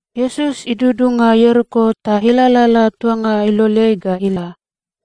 Iesus idudunga Ieriko ta ilalala tuanga iloleai ga ila.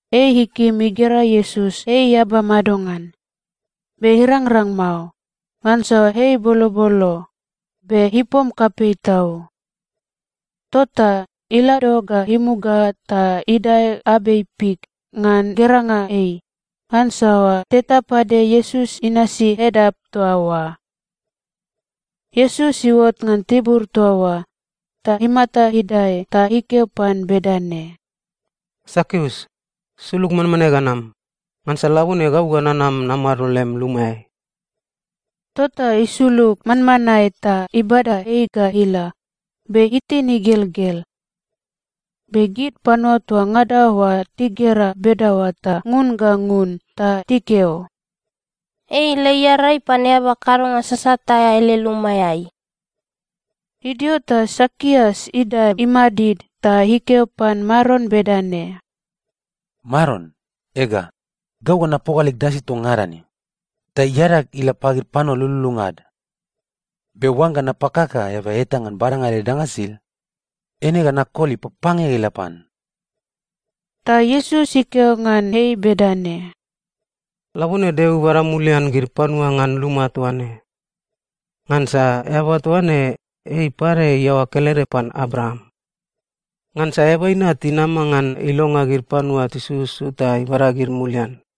Ei ikim igera Iesus ei eaba madongan, be irangrang mao, ngansa ei bolobolo, be ipom kapei tau. Tota ilado ga imuga ta idae abei fik ngan geranga ei, ngansa teta pade Iesus inasi edap toa oa. Iesus iuot ngan tibur toa oa, ta imata idae ta ikeo pan bedane, “Sakius, sulug manmanae ga nam, ngansa labone gau ga nanam namado lem lumaeai.” Tota isulug manmanae ta ibada ei ga ila, be itin igelgel. Be gid panua toa ngada oa tigera bedaoa ta ngun ga ngun ta tikeo, “Ei ila iarai pan eaba kadonga sasat aea ele lumaeai.” Idio ta Sakius idae imadid ta ikeo pan Maron bedane, “Maron, ega, gau ga napoga leg danga sisid toa ngada ne, ta iadag ila pagid panua lululunga ad. Be oangga napakaka eaba eta ngan badanga ele danga sisid, eine ga nakoli papange ga ila pan.” Ta Iesus ikeo ngan ei bedane, “Labone Deo ibada mulian gid panua ngan luma toa ne. Ngansa eaba toa ne, ei pade iaoa kelede pan Abraam. Ngansa Eaba Inat inama ngan ilonga gid panua tisususu ta ibada gid mulian.”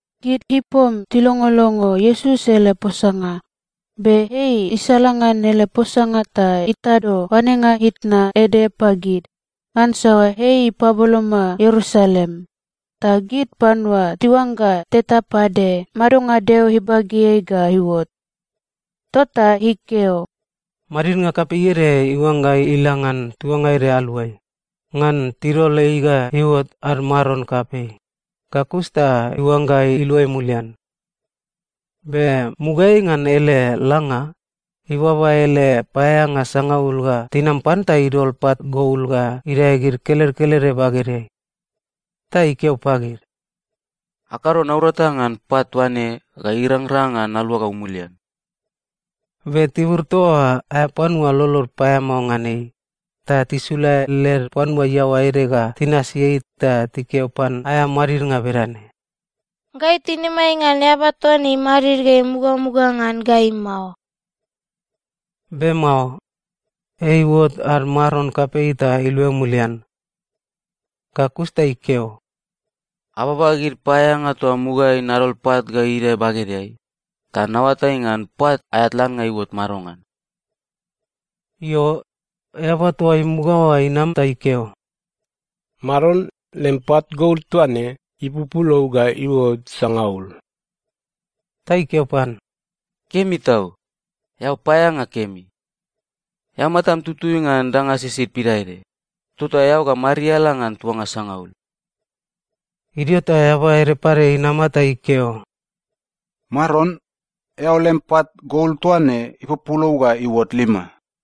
Gid ipom tilongolongo Iesus ele posanga, be ei isalangan ele posanga ta itado oanenga itna ede pagid, ngansa ei ipaboloma Ierusalem, ta gid panua tiuangga teta pade madonga Deo ibageai ga iuot. Tota ikeo, “Madidnga kapei ede iuangga ila ngan tuanga ede aluai, ngan tidol ei ga iuot ad maron kapei, ga kus ta iuangga iluai mulian. Be mugaeai ngan ele langa, ibaba ele paeaeanga sangaul ga tinam pan ta idol pat gol ga idae gid kelede kelede bagedeai. Ta ikeo pagid, ‘Akado naurata ngan pat toa ne ga irangrang ngan naluagau mulian.’ “Be tibur toa oa aea panua lolod paeamao ngan ei, ta tisula led panua iaoa ede ga tinasi ei ta tikeo pan aea madidnga bedane, ‘Gai tinimai ngan eaba toa ne imadid ga imugamuga ngan gai mao.’ “Be mao. Ei iuot ad maron kapei ta iluai mulian. Ga kus ta ikeo, ‘Ababa gid paeaeanga toa mugaeai nadol pat ga idae bagedeai, ta naoatai ngan pat aea tlannga iuot madongan.’ “Io, eaba toa imuga oa inam ta ikeo, ‘Maron, lem pat gol toa ne ipupulou ga iuot sangaul.’ “Ta ikeo pan, ‘Kemi tau! Eao paeaeanga kemi. Eao matam tutui ngan danga sisid pidaede, tota eao ga mariala ngan tuanga sangaul.’ “Idio ta eaba ede pade inama ta ikeo, ‘Maron, eao lem pat gol toa ne ipupulou ga iuot lima.’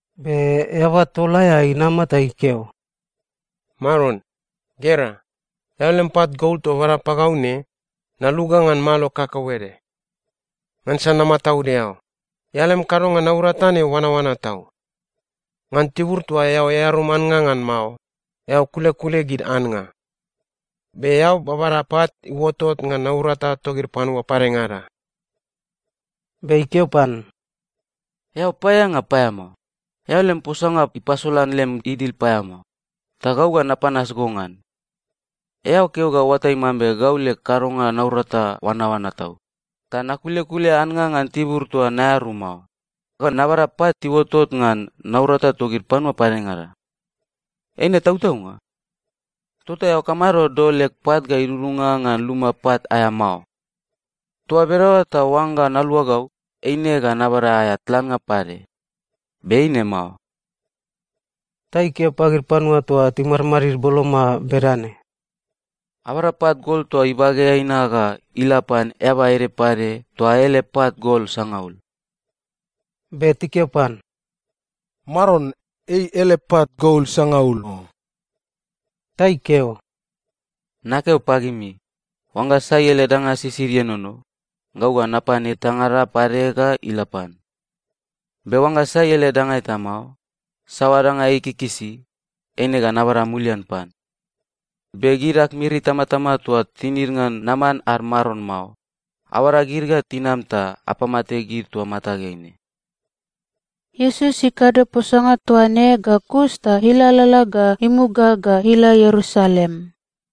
“Be eaba tol aea inama ta ikeo, ‘Maron, gera, eao lem pat gol toa bada pagau ne, naluga ngan malo kakauede. Ngansa namataud eao. Eao lem kadonga naurata ne oanaoana tau. Ngan tibur toa eao earum annga ngan mao, eao kulekule gid annga. Be eao babada pat iuotot ngan naurata togid panua padengada.’ “Be ikeo pan, ‘Eao paeaeanga paeamao! Eao lem posanga ipasolan lem idil paeamao, ta gau ga napanas go ngan. Eao keo ga oatai mambe gau leg kadonga naurata oanaoana tau, ta nakulekule annga ngan tibur toa naearum mao, ga nababada pat iuotot ngan naurata togid panua padengada. Eine tautaunga? Tota eao kamado dol leg pat ga idudunga ngan luma pat aea mao? Toa bedaoa ta oangga naluagau, eine ga nabada aea tlannga pade, be eine mao.’ “Ta ikeo pagid panua toa timadmadid boloma bedane, ‘Abada pat gol toa ibageai na ga ila pan eaba ede pade toa ele pat gol sangaul.’ “Be tikeo pan, ‘Maron, ei ele pat gol sangaul o.’ “Ta ikeo, ‘Nakeo pagimi, oangga sai ele danga sisid ienono, gau ga napan etangada pade ga ila pan. Be oangga sai ele danga eta mao, saoa danga ei ikikisi, eine ga nabada mulian pan. Be gid ag miri itamatama toa tinid ngan naman ad maron mao, abada gid ga tinam ta apamate gid toa matageai ne.’” Iesus ikado posanga toa ne ga kus ta ilalala ga imuga ga ila Ierusalem.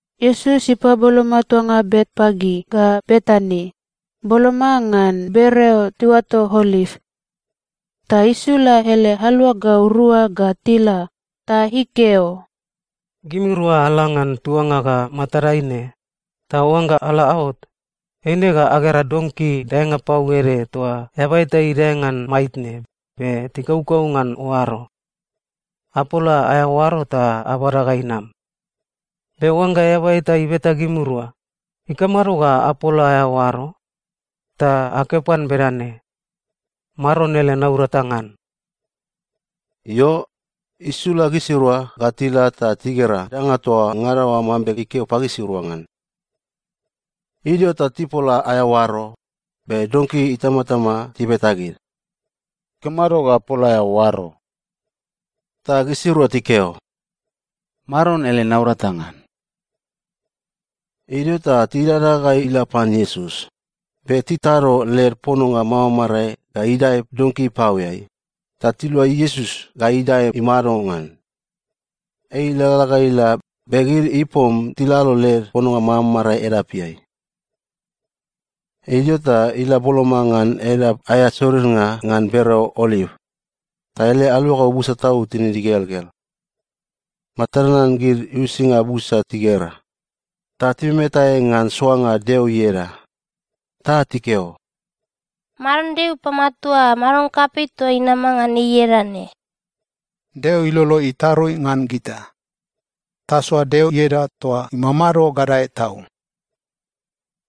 Iesus ipaboloma tuanga Betpage ga Betani, boloma ngan bereo tiuato Oliv. Ta isula ele aluagau rua ga tila ta ikeo, “Gimirua ala ngan tuanga ga matadai ne, ta oangga ala aot, eine ga agera donki daenga pau ede toa eaba eta idae ngan maitne be tikaukau ngan oaro. Apola aea oaro ta abada ga inam. Be oangga eaba eta ibeta gimirua, ‘Ikamado ga apola aea oaro?’ ta akeo pan bedane, ‘Maron ele naurata ngan.’” Io, isula gisirua ga tila ta tigera danga toa ngada oa mambe ikeo pagisirua ngan. Idio ta tipola aea oaro, be donki itamatama tibeta gid, “Ikamado ga apola aea oaro?” Ta gisirua tikeo, “Maron ele naurata ngan.” Idio ta tidada ga ila pan Iesus, be titado led pononga mamarae ga idae donki ipaoeai, ta tilua Iesus ga idae imado ngan. Ei ilalala ga ila, be gid ipom tilalo led pononga mamarae edapeai. Idio ta ila boloma ngan edap aea sorirnga ngan bereo Oliv, ta ele aluagau busa tau tinid igelgel. Matad nanan gid uisinga busa tigera, ta timemetae ngan soanga Deo ieda. Ta tikeo, “Maron Deo ipamatua maron kapei toa inama ngan ei ieda ne!” “Deo ilolo itarui ngan gita! Tasoa Deo ieda toa imamado gadae tau!”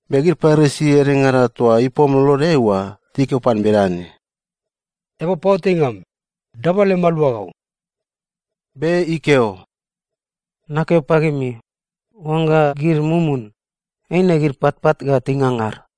Be gid Parisi edengada toa ipom lolodeai oa tikeo pan bedane, “Eaba paoatainga am, daba lem aluagau!” Be ikeo, “Nakeo pagimi, oangga gid mumun, eine gid patpat ga tingangar.”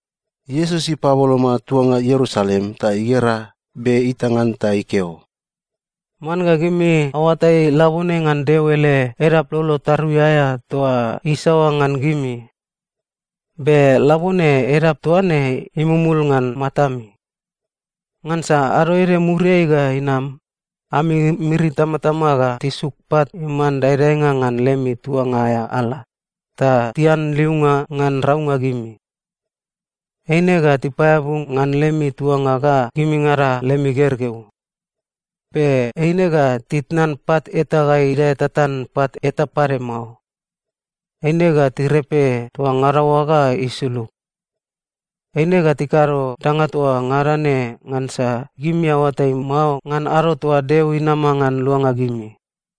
Iesus ipaboloma tuanga Ierusalem ta igera, be itang ngan ta ikeo, “Man ga gimi aoatai labone ngan Deo ele edap lolo tarui aea toa isaoa ngan gimi! Be labone edap toa ne imumul ngan matami. Ngansa ado ede muriai ga inam, ami miri itamatama ga tisuk pat iman daedaenga ngan lemi tuanga aea ala, ta tianliunga ngan raunga gimi. Eine ga tipaeabu ngan lemi tuanga ga gimingada lemi gergeu. Be eine ga titnan pat eta ga idae tatan pat eta pade mao. Eine ga tirepe toa ngada oa ga isulug. Eine ga tikado danga toa ngada ne ngansa gimi aoatai mao ngan ado toa Deo inama ngan luanga gimi.”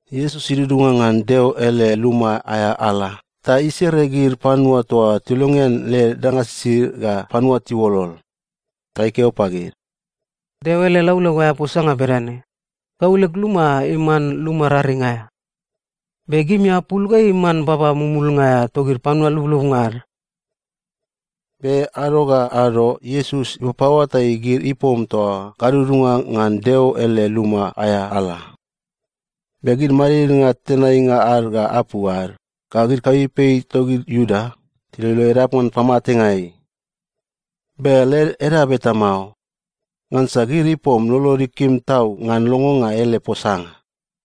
Iesus idudunga ngan Deo ele luma aea ala ta isere gid panua toa tilongean led danga sisid ga panua tiuolol. Ta ikeo pagid, “Deo ele laulau aea posanga bedane, ‘Gau leg luma iman luma raring aea.’ Be gimi apul ga iman baba mumulnga aea togid panua lublubnga ad.” Be ado ga ado, Iesus ipapaoatai gid ipom toa gadudunga ngan Deo ele luma aea ala. Be gid madidnga tenainga ad ga apu ad ga gid kapeipei togid Iuda tiloilo edap ngan pamatenga ei. Be led edap eta mao, ngansa gid ipom lolod ikim tau ngan longonga ele posanga.